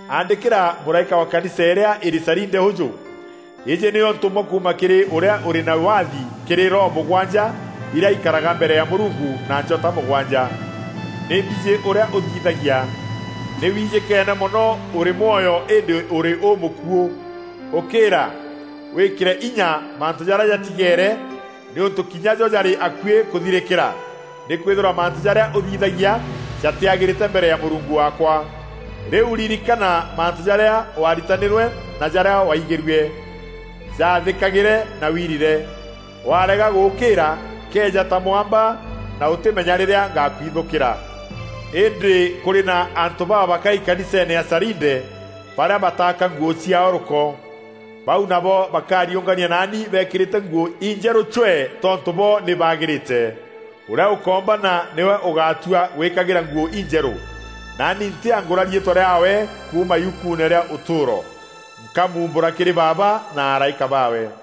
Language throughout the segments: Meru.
“Andîkîra mûraîka wa kanisa îrîa îrî Saride ûjû:” “Îîjî nîyo ntûmwa kuuma kîrî ûrîa ûrî na waathi kîrî roho mûgwanja irîa ikaraga mbere ya Mûrungu na njota mûgwanja. “Nî mbijî ûrîa ûthithagia. Nî wijîkeene mono ûrî mwoyo îndî ûrî ûmûkuû. Ûkîîra! Wîkîre inya mantû jarîa jatigeere nîûntû kinya jo jarî akuî kûthirîkîra. Nîkwîthîrwa mantû jarîa ûthithagia jatîagîrîte mbere ya Mûrungu waakwa. Rîu ririkana mantû jarîa waritanîrwe na jarîa waaigîrue. Jaathîkagîre na wirire. Waarega gûûkîîra, nkeeja ta mwamba na ûtîmenya rîrîa ngakwithûkîra. Îndî kûrî na antû babakai kaniseene ya Saride barîa bataaka nguû ciaao rûko. Bau nabo bakariûngania naani beekîrîte nguû înjerû cwee tontû bo nî bagîrîte. Ûrîa ûkoombana nîwe ûgatua gwîkagîra nguû injerû, naani ntîangûra riîtwa rîaawe kuuma yukuune rîa ûtûûro. Nkaamumbûra kîrî Baaba na araîka baawe.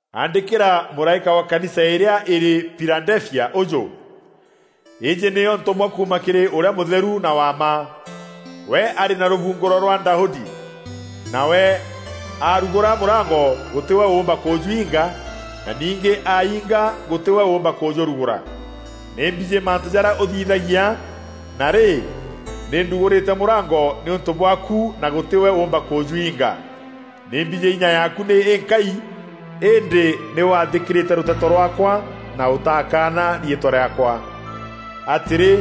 “Andîkîra mûraîka wa kanisa îrîa îrî Filadefia ûjû: Îîjî nîyo ntûmwa kuuma kîrî ûrîa mûtheru na wa mma. We arî na rûbungûro rwa Daudi. Nawe aarugûra mûrango gûtî we ûûmba kûjwiinga na ningî aainga gûtî we ûûmba kûjûrugûra. “Nî mbijî mantû jarîa ûthithagia, na rî, nî ndugûrîte mûrango nîûntû bwaaku na gûtî we ûûmba kûjwiinga. Nî mbijî inya yaaku nî înkai îndî nî wathîkîrîte rûteto rwaakwa na ûtakaana riîtwa rîaakwa. Atîrî!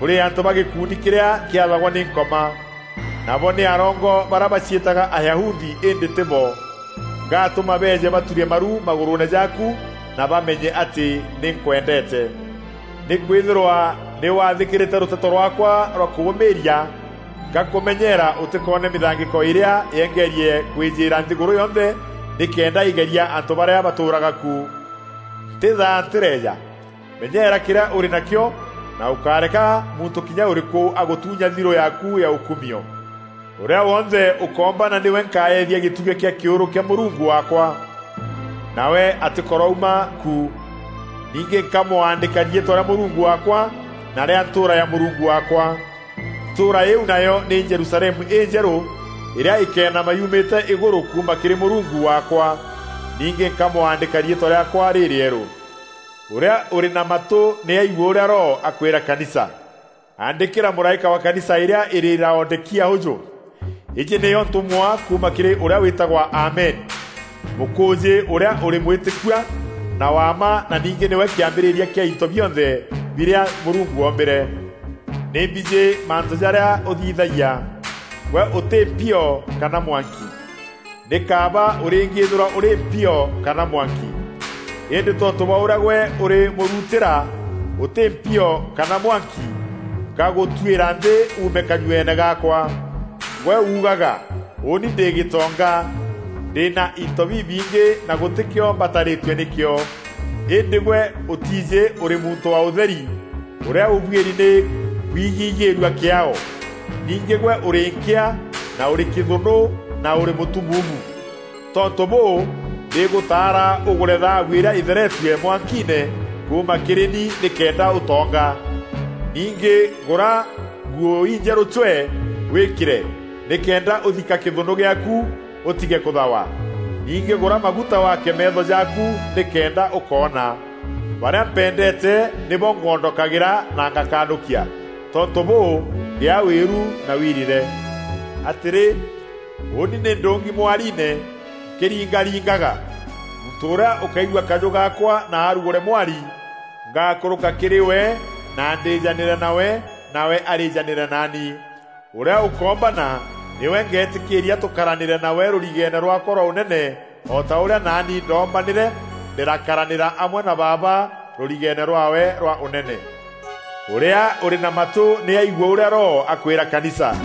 Kûrî antû ba gîkundi kîrîa kîathagwa nî Nkoma. Nabo nî arongo barîa baciîtaga Ayahudi îndî tîbo. Ngatûma beeje baturie maru magûrûûne jaaku na bamenye atî nî nkwendeete. Nîkwîthîrwa nî wathîkîrîte rûteto rwaakwa rwa kûmîîria, ngakûmenyeera ûtîkoone mîthangîko îrîa yengeerie kwîjîîra nthîgûrû yonthe nîkenda îgeria antû barîa batûûraga ku. Ntîthaa ntîreeja. Menyeera kîrîa ûrî nakîo na ûkáreka muntû kinya ûrîkû agûtuunya thirû yaaku ya ûkumio. Ûrîa wonthe ûkoombana nîwe nkaeethia gîtugî gîa kîûrû gîa Mûrungu waakwa, nawe atîkorouma ku. Ningî nkamwandîka riîtwa rîa Mûrungu waakwa na rîa ntûûra ya Mûrungu waakwa. Ntûûra îîu nayo nî Jerusalemu înjerû îrîa îkenama yumîte îgûrû kuuma kîrî Mûrungu waakwa. Ningî nkamwandîka riîtwa rîaakwa rîrîerû. Ûrîa ûrî na matû nî aigue ûrîa Roho akwîra kanisa.” “Andîkîra mûraîka wa kanisa îrîa îrî Laodîkia ûjû: Îîjî nîyo ntûmwa kuuma kîrî ûrîa wîtagwa Amen, mûkûûjî ûrîa ûrî mwîtîkua na wa mma na ningî nîwe kîambîrîria kîa into bionthe birîa Mûrungu ombîre. “Nî mbijî mantû jarîa ûthithagia: gwe ûtî mpio kana mwanki. Nî kaaba ûrîngîthîrwa ûrî mpio kana mwanki. Îndî tontû bwa ûrîa gwe ûrî mûruutîra; ûtî mpio kana mwanki, ngagûtwîra nthî uume kanyueene gaakwa. Gwe uugaga, ‘Ûûni ndî gîtonga; ndî na into bibingî na gûtîkio mbatarîtue nîkîo.’ Îndî gwe ûtiijî ûrî muntû wa ûtheri ûrîa ûbuîri nî kwigîgîîrua kîaao. Ningî gwe ûrî nkîa na ûrî kîthûnû na ûrî mûtumuumu. Tontû bûû, ndîgûtaara ûgûre thaabu îrîa îtheretue mwankiine kuuma kîrî ni nîkenda ûtonga. Ningî gûra nguû injerû cwee wîkîre nîkenda ûthika kîthûnû gîaaku ûtige kûthawa. Ningî gûra maguta wake meetho jaaku nîkenda ûkoona. Barîa mpendeete nîbo ngondokagîra na ngakanûkia. Tontû bûû, gîa wîru na wirire. Atîrî, ûûni nî ndûngi mwariine nkîringaringaga. Muntû ûrîa ûkaigua kajû gaakwa na arugûre mwari, ngakûrûka kîrî we na ndîjanîre nawe, nawe arîjanîre naani. Ûrîa ûkoombana, nîwe ngeetîkîîria tûkaranîre nawe rûrigeene rwaakwa rwa ûnene o ta ûrîa naani ndoombanîre ndîrakaranîra amwe na Baaba rûrigeene rwaawe rwa ûnene. Ûrîa ûrî na matû nî aigue ûrîa Roho akwîra kanisa.”